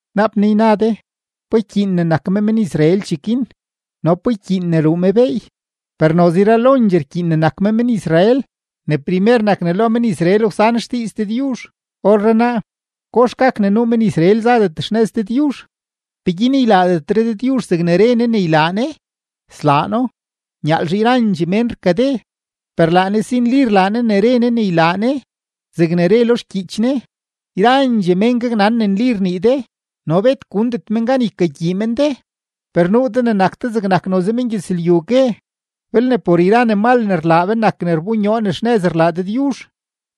Naap naa yna de: “¿Pa ykyiin ne nak me men-Israel cheguin? ¿no pa ykyiin ne ruu me beey?” Per noze yralondxee rkyiin ne nak me men-Israel. Ne primer nak ne lo men-Israel wsan xdiiz Dëdyuzh. Orrenaa, ¿kox gak ne nuu men-Israel zadet xnëz Dëdyuzh? ¿Peguin ylaadetre Dëdyuzh zegne re Ne ne ylaa Ne? Slaa No; nyaalzhe yrandxee mén rkade, per laa Ne si nli rlaa Ne ne re Ne ne ylaa Ne, zegne re lo xgyiich Ne: Yrandxee mén gaknan ne nli rnii de, no bet gundet men gan ykagyii men de. Per nuu de ne nak de zegnak noze mengyëzlyu gue: “Belne por yra ne mal ne rlaa be nak ne rbonyoo ne xnëz rlaa Dëdyuzh,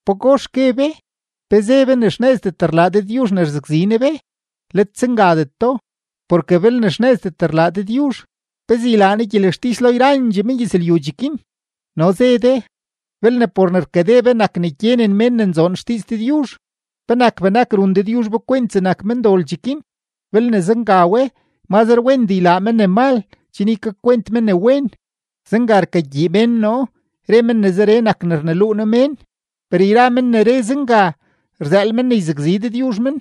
¿pagox gue be? ¿Pe ze be ne xnëzdet rlaa Dëdyuzh ne rzakzi Ne be?” ¡Let zengadeto! Porke belne xnëzdet rlaa Dëdyuzh, ¿pezee ylaa Ne gyelextis lo yrandxee mengyëzlyu cheguin? No ze de: “Belne por ne rkade be nak ne gyenen mén ne nzoon xdiiz Dëdyuzh, ¿penak benak run Dëdyuzh be kwent zegnak mendol cheguin? Belne zenga we, mazre wendee ylaa me ne mal chen ykakwent me ne wen.” Zenga rkagyii mén noo, re men ne zeree nak ne rneluu noo mén, per yra men ne re zenga, rzëël men ne yzakzi Dëdyuzh men.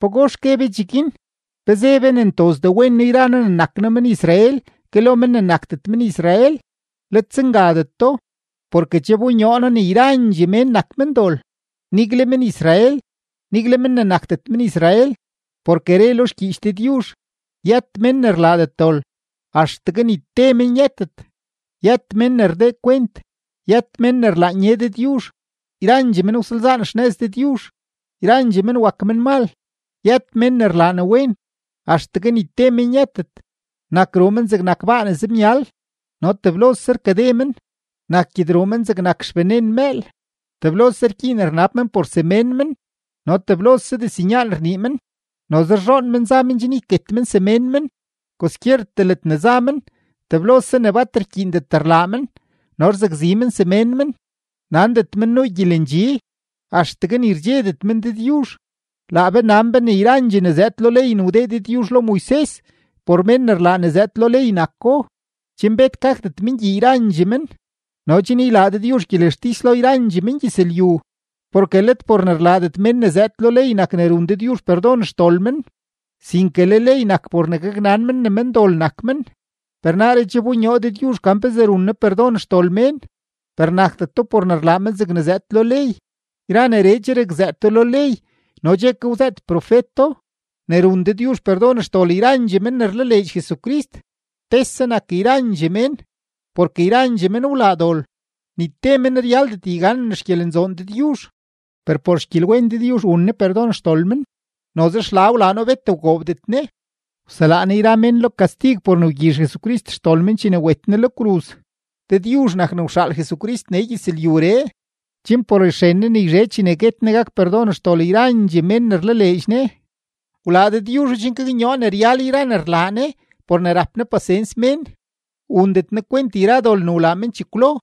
¿Pagox gue be cheguin? ¿Pe ze be ne ntozdee wen noo yra noo ne nak noo men-Israel ke lo men ne nakdet men-Israel? ¡Let zengadeto! Porke che wbonyoo noo ne yrandxee mén nak mendol, nigle men-Israel, nigle men ne nakdet men-Israel. Porke re lo xgyiich Dëdyuzh: Yët mén ne rlaadet dol, axtegue ni te men yëtet; yët mén ne rdee kwent, yët mén ne rlaan ye Dëdyuzh. Yrandxee men wsalzaan xnëz Dëdyuzh, yrandxee men wak menmal. Yët mén ne rlaa ne wen, axtegue ni te men yëtet. Nak ruu men zegnak baa ne zemyal, no teblose rkade men. Nak gyedruu men zegnak xbenen mëël; teblose rgyiin rnab men por semén men no teblose diznyaan rnii men. Noze rzhoon men za men chen yket men semén men. Kwaskyertee ledne za men, teblose ne bat rkyiindet rlaa men no rzakzi men semén men. Nandet men nuu gyelendxi. Axtegue ni rdxedet men Dëdyuzh. Laa be nan be ne yrandxee ne zëëd lo ley ne wdee Dëdyuzh lo Moises por mén ne rlaa ne zëëd lo ley nako, chen bet gakdet men gyii yrandxee men no chen ylaa Dëdyuzh gyelextis lo yrandxee mengyëzlyu. Porke let por ne rlaadet mén ne zëëd lo ley nak ne run Dëdyuzh perdon xdol men, sinke le ley nak por ne gaknan men ne mendol nak men. Per naaree che wbonyoo Dëdyuzh gan pezee run Ne perdon xdol mén, per nakdeto por ne rlaa men zegne zëëd lo ley. Yra neree che rakzëëto lo ley no che ke wzëët profeto, ne run Dëdyuzh perdon xdol yrandxee men ne rlaleedx Jesucrist. Tese nak yrandxee mén porke yrandxee men wlaa dol, ni te men ryaldet yganen xgyelenzoon Dëdyuzh. Per por xgyelwen Dëdyuzh wun Ne perdon xdol men, noze xla wlaa No bet wgoobdet Ne; wselaa Ne yra mén lo kastig por ne wgyizh Jesucrist xdol men chene wet Ne lo kruz. Dëdyuzh nak ne wxaal Jesucrist nee gyëzlyuree, chen por xren Ne ne yzhe chene guet Ne gak perdon xdol yrandxee mén ne rlaleedx Ne. Wlaa Dëdyuzho chen gaknyoo ne ryal yra ne rlaa Ne por ne rap Ne pasens mén, wundet Ne kwent yra dol ne wlaa men chekwlo,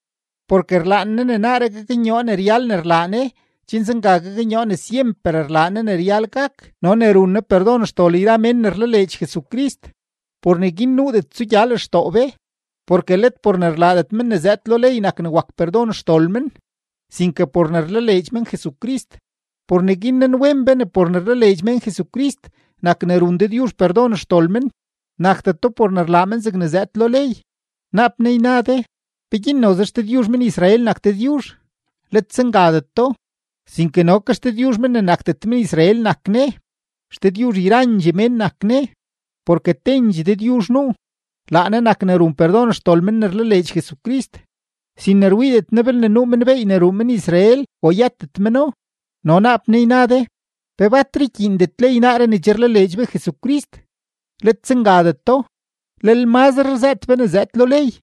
porke rlaan Ne ne naaree gaknyoo ne ryal ne rlaa Ne chen zenga gaknyoo ne syemper rlaa Ne ne ryal gak no ne run Ne perdon xdol yra mén ne rlaleedx Jesucrist. Por neguin nuudet tsugya lextoo be. Porke let por ne rlaadet men ne zëëd lo ley nak ne wak perdon xdol men, sinke por ne rlaleedx men Jesucrist. Por neguin nanwen be ne por ne rlaleedx mén Jesucrist nak ne run Dëdyuzh perdon xdol men, nakdeto por ne rlaa men zegne zëëd lo ley. Naap naa yna de: “¿Peguin noze XDëdyuzh men-Israel nak Dëdyuzh?” ¡Let zengadeto! Sinke no ke XDëdyuzh men ne nakdet men-Israel nak Ne. XDëdyuzh yrandxee mén nak Ne. Porke tendxee Dëdyuzh nuu: laa Ne nak ne run perdon xdol men ne rlaleedx Jesucrist, sin ne rwiidet Ne belne nuu men beey ne ruu men-Israel o yëtet meno. No naap naa yna de: “¿Pe batre rkyiindet ley naaree ne che rlaleedx be Jesucrist?” ¡Let zengadeto! Lel mazre rzëët be ne zëëd lo ley.